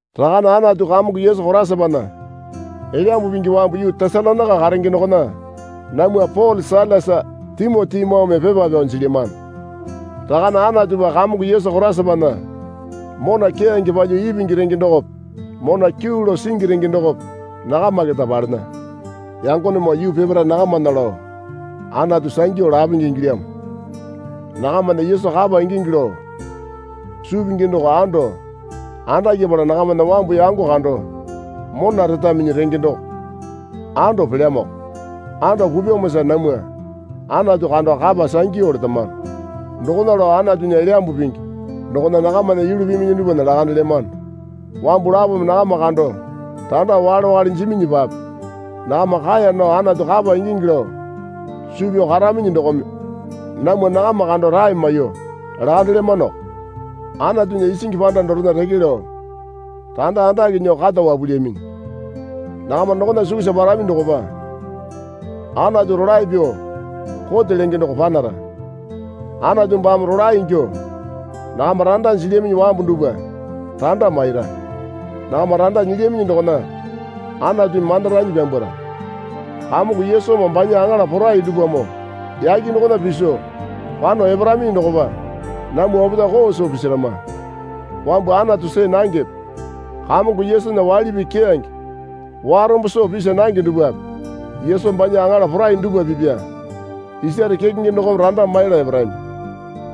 Rakane Anatu Kamongo Yesu Koraisapana Elyambu Pingi wambu yuu Tesalonaika karenge dokona namwa Pole Sailasa Timotimoome pepa pyao jilyamano. Rakane Anatupa Kamongo Yesu Koraisapana mona keyange palyuo ipingi renge dokope mona kyuu lao singi renge dokope nakama keta palena. Yangonemoo yuu peparae nakamana lao Anatu sangyu lapenge ingilyamo. Nakamana Yesu kapa ingingi lao suu pingi doko ando andakyapala nakamana wambu yango kando mona retaminyi renge doko ando pelyamoko. Ando pupyamosa namwa Anatu kando kapa sangyu letamano. Dokona lao Anatunya Elyambu Pingi dokona nakamana yulu piminyi dupwana lakandelyamano. Wambu lapome nakama kando randa wakale wakale jiminyipape nakama kaeya nao Anatu kapa ingingi lao suu pyao karaminyi dokome namwa nakama kando rae maiyuo lakandelyamanoko. Anatunya isingi panda dorena reke lao randa andake nyuo kata wapulyaminyi. Nakama dokona sukusa parami dokopa Anatu rolae pyuo kote lenge doko panara. Anatu baame rolae ingyuo nakama randa jilyaminyi wambu dupwa randa maira. Nakama randa nyilyaminyi dokona Anatumi mandaranyi pyambwara. Kamongo Yesumoo banya aŋala porai dupwamoo yake dokona piso pano eparaminyi dokopa namwa opetae koo soo pisarama. Wambu Anatu see nangepe Kamongo Yesunya waili pii keyange warombo soo pisa nange dupwape Yesu banya aŋala porai dupwa pipya isare kekenge dokome randa maiyala eparami.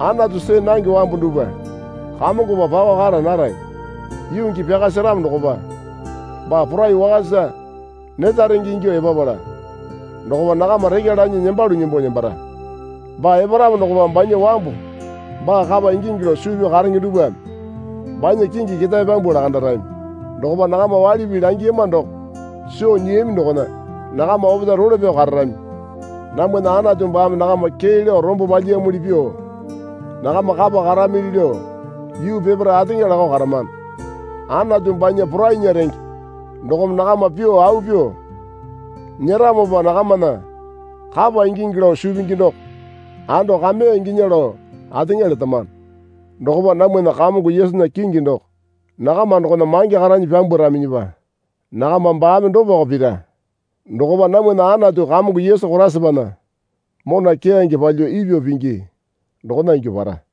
Anatu see nange wambu dupwa Kamongopa pakao kara narami. Yuu gii pyaka seramo dokopa baa porai wakasa neta renge ingyuo epapala dokopa nakama rekya lanyi nembalu nembo nembara. Baa eparamo dokopa banya wambu baa kapa ingingi lao suu pyao karenge dupwame banya kingi ketae pyambuo lakandarami. Dokopa nakama waili pii langiyama doko soo nyiyami dokona nakama opetae role pyao kararami. Namwana Anatu baame nakama kee lao rombo palyiyamuli pyuo nakama kapa karamili lao yuu peparae ateŋa lakao karamano. Anatu banya porainya renge dokome nakama pyuo au pyuo nyeramopa nakamana kapa ingingi lao suu pingi doko ando kameya inginya lao ateŋa letamano. Dokopa namwana Kamongo Yesunya kingi doko nakama dokona mange karanyi pyambwaraminyipa nakama baame dopako pira. Dokopa namwana Anatu Kamongo Yesu Koraisapana mona keyange palyuo ipyuo pingi dokona ingyuo para.